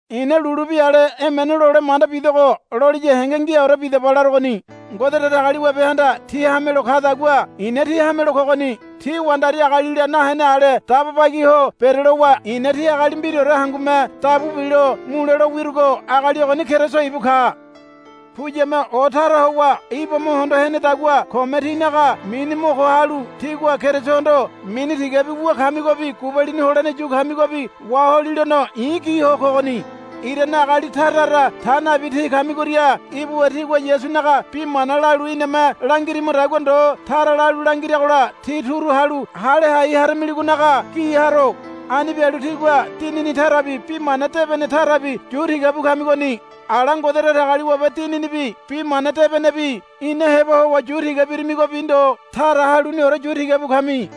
I̱na lulu bi ale emene lole manda bidogo loliya henge ngiaore bidaba larogoni. Ngode Datagaliwabehanda tí hamelo kadagua i̱na tí hamelo kogoni. Tí wandari agalila nahene ale daba bagi ho berelowa i̱na tí agali mbiraore hangume dabu bilo mule lo wirugo agali ogoni Keriso ibu ka. Puyame o tara howa Iba mo hondo henedagua kome tínaga mini mo ko halu tígua Kerisohondo mini tigabi wu kamigobi gubalini holene yu kamigobi waholilono i̱ gi ho kogoni. Irane agali tara tara ta nabi tí kamigoria ibuwa tigua Yasunaga bi mana lalu iname langirimagodagua ndo tara lalu langiragola tí turu halu hale hai haramiligonaga gi haro. Ani bialu tígua dinini tarabi bi mana debene tarabi yu tiga bu kamigoni. Ala Ngode Datagaliwabe Dininibi Bi Mana Debenebi ina heba howa yu tiga birimigobi ndo tara haluniore yu tiga bu kami.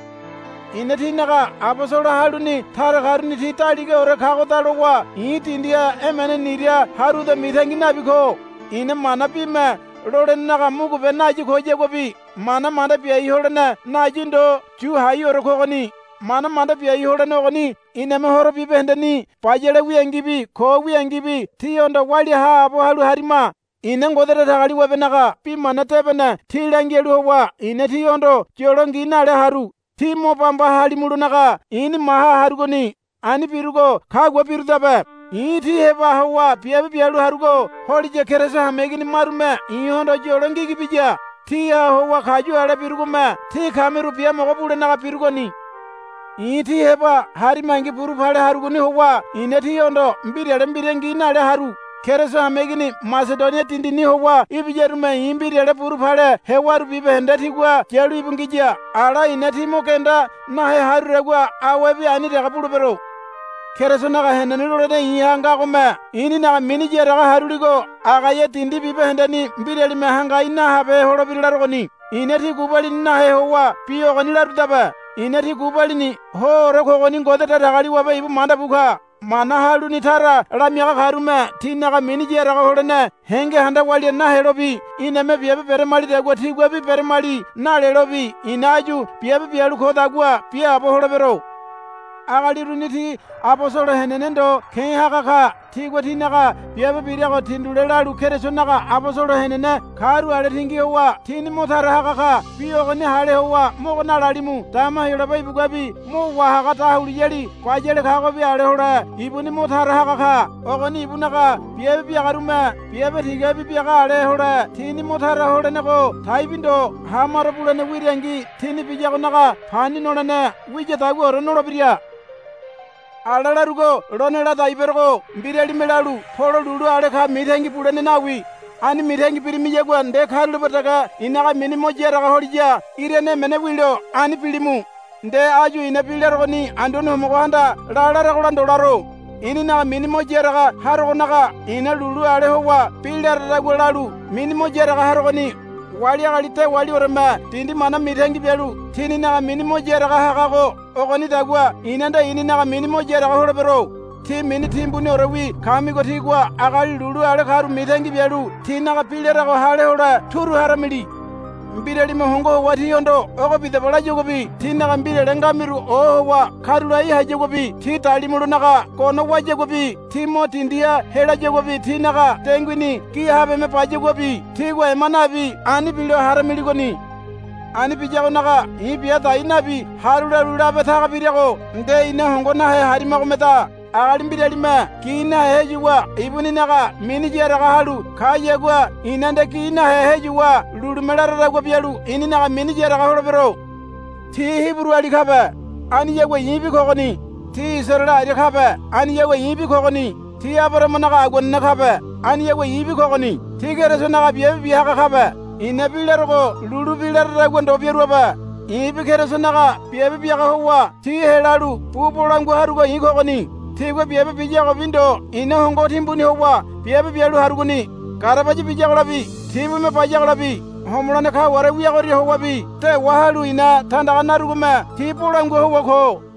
I̱na tínaga abosolo haluni tara karuni ti daligaore kagoda lowa i̱ dindiha emene nira haruda mitangi nabi ko. I̱na mana bime lolenenaga mugube nayi koyaguabi mana manda biai holene nayi ndo yu haiore kogoni. Mana manda biai holene ogoni iname horo bibahendeni bayale wiangibi ko wiangibi tíhondo walia haabo halu harima. I̱na Ngode Datagaliwabenaga Bi Mana Debene tí langialu howa i̱na tíhondo yolo ngi nale haru. Tí mo bamba halimulonaga i̱ni maha harugoni. Ani birugo kagua birudabe. I̱ tí heba howa biabe bialu harugo holiya Keriso hameigini marume i̱hondo yolo ngigi biya. Tiha howa kayu ale birugome tí kamiru biamogo bulenaga birugoni. I̱ tí heba harimangi buru pale harugoni howa i̱na tíhondo mbirale mbira ngi nale haru. Keriso hameigini Masedonia dindini howa ibiyarume i̱ mbirale buru pale hewaru bibahende tigua yalu íbu ngiya. Ala i̱na tí mo genda nahe harudagua awebi ani dege bulebero. Kerisonaga henene lolene i̱ha ngagome i̱ninaga mini yaraga haruligo Agaia dindi bibahendeni mbiralime hangai nahabehe holebira larogoni. I̱na tí gubalini nahe howa bi ogoni larudabe. I̱na tí gubalini hoore kogoni Ngode Datagaliwabe ibu manda bu ka. Mana haluni tara lamiaga karume tininaga mini yaraga holene henge handa walia nahelobi iname biabe beramalidagua tiguabi, Beramali, nalelobi i̱na áyu biabe bialu kogodagua biaabo holebero. Agali uruni ti abosolo henene ndo ke̱ haga ka. Tigua tinaga biabe birago tindule lalu Kerisonaga abosolo henene karu ale tingi howa tini mo tara haga ka. Bi ogoni hale howa mogo nalalimu. Dama Heyolabe ibuguabi mo wá haga dahuliyali bayale kagobi ale hole ibuni mo tara haga ka. Ogoni ibunaga biabe biagarume biabe tigabi biaga ale hole tini mo tara holenego taibi ndo. Hamaro bulene wirangi tini biyagonaga pani nolene wiyadaguaore nolebira. Ala larugo lone ladai berogo. Mbiralime lalu, Polo lulu ale ka, mitangi bulene nawi. Ani mitangi birimiyagua nde karulape dege i̱naga mini mo yaraga holiya irane emene wilo ani bilimu. Nde áyu i̱na bi larogoni Anduane Homogohanda, La, laragola ndo laro. I̱ninaga mini mo yaraga harogonaga i̱na lulu ale howa bi laradagua lalu mini mo yaraga harogoni. Wali agali dewalioreme dindi mana mitangi bialu tininaga mini mo yaraga hagago ogonidagua i̱na nde i̱ninaga mini mo yaraga holebero. Tí mini timbuniorewi kamigo tígua agali lulu ale karu mitangi bialu tinaga bi larago hale hole turu haramili. Mbiralime hongo howa tíhondo, Ogo bidaba, layaguabi tínaga mbirale ngamiru ohowa karulai hayaguabi tí dalimulonaga gono wayaguabi tí mo dindiha helayaguabi tínaga denguini gi habeme bayaguabi tígua ema nabi ani bilo haramiligoni. Ani biyagonaga i̱ bia dai nabi haru lalu labe taga birago nde ina hongo nahe harimagomeda. Agali mbiralime gi nahe heyuwa ibuninaga mini yaraga halu kayagua i̱na nde gi nahe heyuwa lulume laradagua bialu i̱ninaga mini yaraga holebero. Ti Hiburuali kabe. Aniyagua i̱bi kogoni. Ti Isaraele aria kabe. Aniyagua i̱bi kogoni. Ti Abarahamanaga aguanene kabe. Aniyagua i̱bi kogoni. Ti Kerisonaga biabe biaga kabe. I̱na bi larogo lulu bi laradagua ndo biaruabe. I̱bi Kerisonaga biabe biaga howa ti helalu bu bolangua harugo i̱ kogoni. Tigua biabe biyagobi ndo i̱na hongo timbuni howa biabe bialu harugoni. Garabaya biyagolabi tibume bayagolabi homolene kaware wiagoria howabi dewa halu i̱na tandaga narugome ti bolangua howa ko.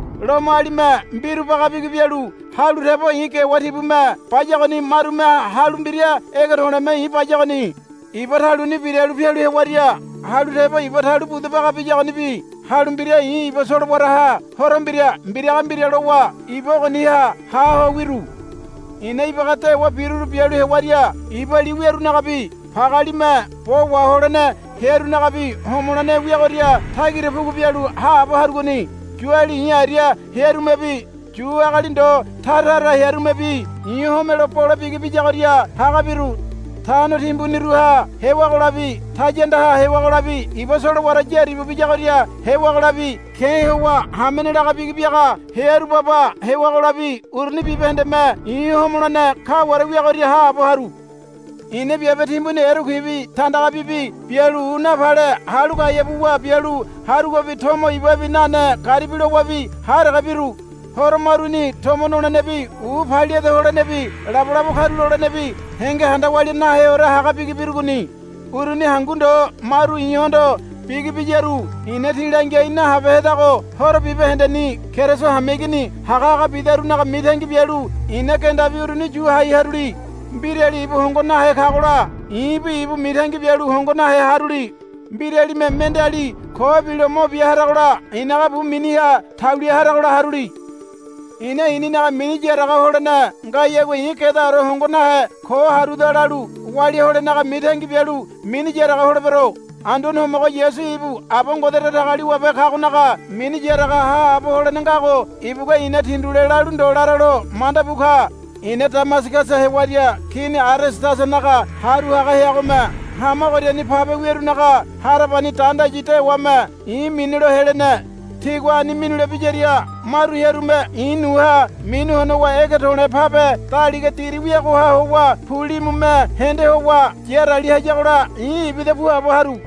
Lomoalime mbiru baga bigi bialu halu tebo i̱ gewa tibume bayagoni. Marume halu mbira ege to̱le̱me i̱ bayagoni. Iba taluni biralu pialu hewaria halu tebo iba talu budu baga biyagonibi halu mbira i̱ iba solowaraha horo mbira mbiraga mbira lowa iba ogoniha ha ho wiru. I̱na ibaga dewa biruru bialu hewaria iba li wiarunagabi pagealime bo waholene hearunagabi homolene wiagoria tagira pugu bialu haabo harugoni. Yuali i̱ aria hearumebi Yu agali ndo tara tara hearumebi i̱ homelo bole bigi biyagoria haga biru. Tano timbuniruha hewagolabi tayandaha hewagolabi iba solowara yaribu biyagoria hewagolabi ke̱ howa hamene laga bigi biaga hearu baba hewagolabi uruni bibahendeme i̱ homolene kaware wiagoria haabo haru. I̱na biabe timbuni erekuibi tandagabibi bialu u napale halu gaea buwa bialu harugobi tomo ibabi nane garibi lowabi ha dege biru. Horo maruni tomo nolenebi u paliade holenebi labolabo karulolenebi henge handa walia naheore haga bigi birugoni. Uruni hangu ndo maru i̱hondo bigi biyaru i̱na tí langiai nahabehedago horo bibahendeni Keriso hameigini hagahaga bidarunaga mitangi bialu i̱na gendabi uruni yu hai haruli. Mbirali ibu hongo nahe kagola i̱bi ibu mitangi bialu hongo nahe haruli. Mbiralime mendeali ko bilo mo bia haragola i̱naga bu miniha taulia haragola haruli. I̱na i̱ninaga mini yaraga holene ngayagua i̱ gedaore hongo nahe ko haruda lalu walia holenaga mitangi bialu mini yaraga holebero. Anduane Homogo Yasu ibu Aba Ngode Datagaliwabe kagonaga mini yaraga haabo holene ngago ibugua i̱na tindule lalu ndo laralo manda bu ka. I̱na Damasagasa hewaria Kini Aredasanaga haru haga heagome hama ogoriani pabe wearunaga harabani dandayi dewame i̱ minilo helene. Tigua ani minule biyaria maru hearume i̱ nuha minu honowa ege to̱le̱ pabe daliga diri wiagoha howa pulimume hende howa yarali hayagola i̱ ibida puabo haru.